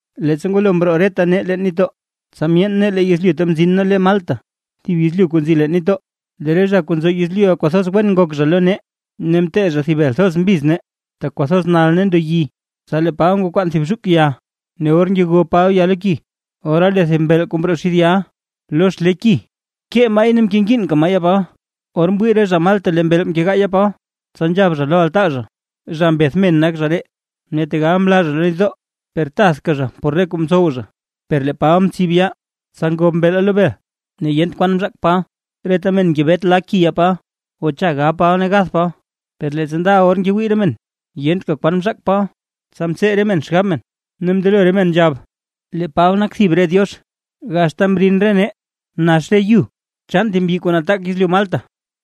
Leettsa ngwalo mroo reta nee leen nitdoo, tsa myeen nee lee yezlyu ta mzin nee le Malta, thib yezlyu kuu nzi leen nitdoo. Lee re zha kuu nzo yezlyuʼa kwathoz wen ngok zha lo nee. Ne mtee zha thib bel thoz mbiz nee, tak kwathoz nal ne ndo yi. Tsa lee Paba ngwakwaan thib zhuk ya, ne or ngego Paba ya lo ki, ora lee thib mbeel kuu mroo xid yaʼa por xlee ki, mkee maay ne mkengiinka maa yaa Paba. Or mwii re zha Malta lee mbeel nkegaa yaa Paba, tsa nzhab zha lo altaa zha: ―Zha mbeth men nak zha ree, ne tegal mlaa zha lo nitdoo, per tathka zha por re kuu mtsow zha. Per lee Paba mtsib yaa, tsa ngob mbeela lo bel, ne yent kwan mzhaak Paba. Reta men ngebet la ki yaa Paba o cha gab Paba ne gath Paba. Per leettsa ndaʼa or ngewii re men yentka kwan mzhaak Paba, tsa mtsee re men xgab men, ne mndelo re men nzhab lee Paba nak thib re diox. Gax ta mrin nee nax re yu chaan thib mbyi kuu nataak yezlyu Malta,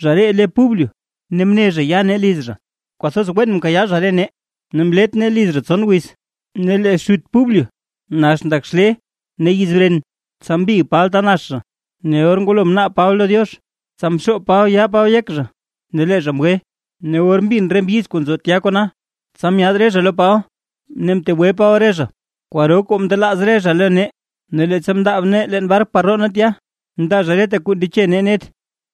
zha ree le Publio, ne mne zha ya nee liz zha, kwathoz wen mkayaa zha re nee, ne mlet nee liz zha tson wiz. Ne lee xut Publio nax ndak xlee ne yiz bren. Tsa mbig Paba ta nax zha, ne or ngwalo mnaab Paba lo Diox tsa mxoob Paba yaa Paba yek zha, ne lee zha mgwe. Ne or mbin re mbyiz kuu nzo tya kona, tsa myaad re zha lo Paba ne mtegwe Paba re zha. Kwaro kwaa mndelaaz re zha lo nee. Ne leettsa mndaab nee leen bark par roo nee tya, mndaa zha reta kuu ndeche nee net.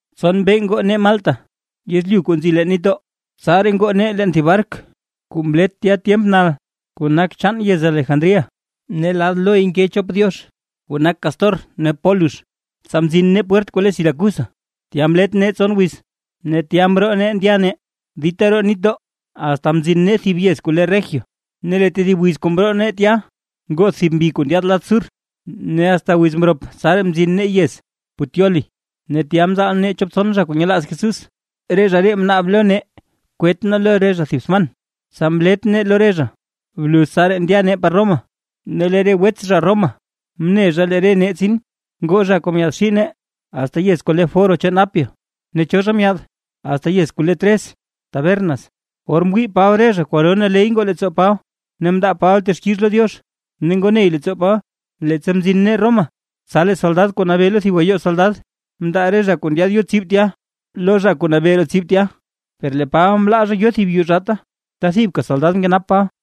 Tson mbee ngoo nee Malta yezlyu kuu nzi leen nitdoo, tsaraa ngoo nee leen thib bark kuu mlet tya tyemp nal, kuu nak chaan yez Alejandría. Ne lad loy nke chop diox kuu nak Cástor ne Pólux. Tsa mzin nee pwert kuu le Siracusa, tya mlet nee tson wiz, ne tya mroo nee ndya nee dita roo nitdoo, asta mzin nee thib yez kuu le Regio. Ne lee tedib wiz kuu mroo nee tya, ngoth thib mbi kuu ndyaad lad sur, ne asta wiz mrop tsaraa mzin nee yez Puteoli. Ne tya mzaal nee chop tson zha kuu nyelaaz Jesús, re zha ree mnaab lo nee kwet nee lo re zha thib sman, tsa mlet nee lo re zha. Bluz tsaraa ndya nee par Roma. Ne lee re wets zha Roma mne zha lee re nee tsin, ngoo cho zha myaadxii net zha nee, asta yez kuu le Foro chaan Apio ne cho zha myaad asta yez kuu le Tres Tabernas. Or mwii Paba re zha kwaro naley ngoo leettsoo Paba ne mndaa Paba texkix lo Diox ne ngoo ney leettsoo Paba. Leettsa mzin nee Roma, tsa lee soldad kuu nabee lo thib gayoo soldad, mndaa re zha kuu ndyaad yo tsib tya, lo zha kuu nabee roo tsib tya, per lee Paba mlaa zha yo thib yuu zhaata, ta thibka soldad mkenap Paba.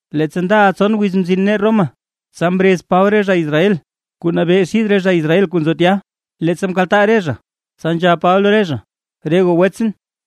Leettsa ndaʼa tson wiz mzin nee Roma, tsa mrez Paba re zha Israel kuu nabee xid re zha Israel kuu nzo tya. Leettsa mkaltaa re zha, tsa nzhab Paba lo re zha: ―Re goo wets,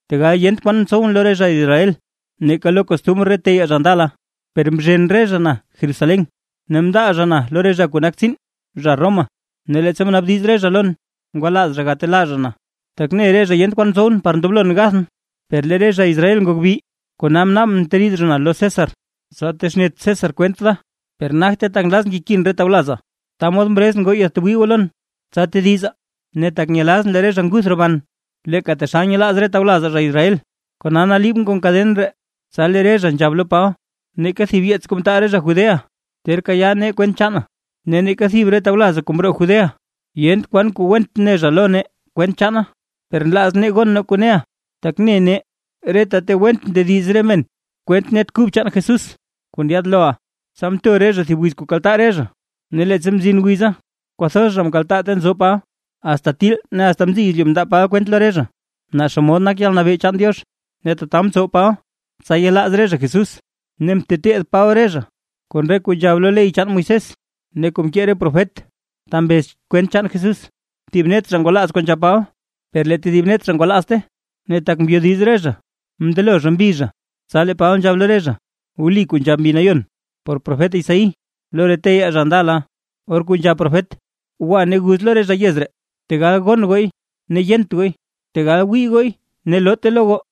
tegal yent kwan mtsowʼn lo re zha Israel neeka lo re costumr re teyaa zha ndala, per mzhen re zha na Jerusalén, ne mndaa zha na lo re zha kuu nak tsiin zha Roma. Ne leettsa mnaabdiz re zha lon, ngwalaaz zha gatelaa zha na, tak mne re zha yent kwan mtsow par ndoblon gathʼn. Per lee re zha Israel ngok bi, kona mnaabʼn mteriid zha na lo César, tsa texnet César kwent da, per nagte tak nlazʼn kekin re tawlazaa. Ta mod mrezʼn goo yaadtwii goo lon tsa tedizaa, ne tak nyelazʼn lee re zha nguth roban, leeka taxal nyelaaz re tawlazaa zha Israel, kona naliibʼn kon kaden ree. Tsa lee re zha nzhab lo Paba: ―Neeka thib yeets kuu mtaal re zha Judea ter kayaa nee kwent chaana, ne neeka thib re tawlazaa kuu mroo Judea, yent kwan kuu went ne zha lo nee kwent chaana. Per nlaaz nee gon nee kuu neʼa, tak ne nee reta ta went ndediz re men kwent Net Kub chaan Jesús kuu ndyaad loʼa. Tsa mto re zha thib wiz kuu kaltaa re zha. Ne leettsa mzin wiza kwathoz zha mkaltaa ta nzo Paba. Asta til ne asta mziy yezlyu mndaa Paba kwent lo re zha naa xomod nak yalnabee chaan Diox. Ne tata mtsow Paba tsa yelaaz re zha Jesús, ne mteteed Paba re zha kon re kuu nzhab lo ley chaan Moisés ne kuu mkee re profet ta mbez kwent chaan Jesús. Thib net zha ngwalaaz kuu nzhab Paba, per lee tedib net zha ngwalaazte. Ne tak mbyodiz re zha, mndelo re zha mbi zha. Tsa lee Paba nzhab lo re zha: ―Wli kuu nzhab Mbi Nayon por profet Isaí lo re teyaa zha ndala, or kuu nzhab profet: Gwa ne guz lo re zha yez ree: Tegal gon gooy ne yent gooy, tegal wii gooy ne loote lo goo.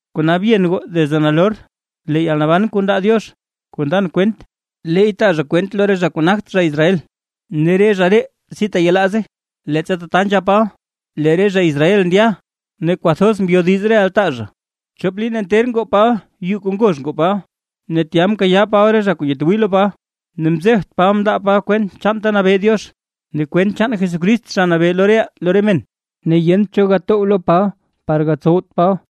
’Kona byen goo desde nalor, lee yalnaban kuu ndaa Diox, kuu ndan kwent, leey taa zha kwent lo re zha kuu nagt zha Israel ne re zha ree si teyelaaze. Leettsa tata nzhab Paba, lee re zha Israel ndya ne kwathoz mbyodiz re altaa zha. Chop liin nter ngoo Paba yuu kuu ngozh ngoo Paba, ne tya nkayaa Paba re zha kuu nyatwii lo Paba. Ne mzebt Paba mndaa Paba kwent chaan ta nabee Diox ne kwent chaan Jesucrist Zha Nabee lo reʼaa lo re men, ne yent cho gatow lo Paba par gatsowt Paba.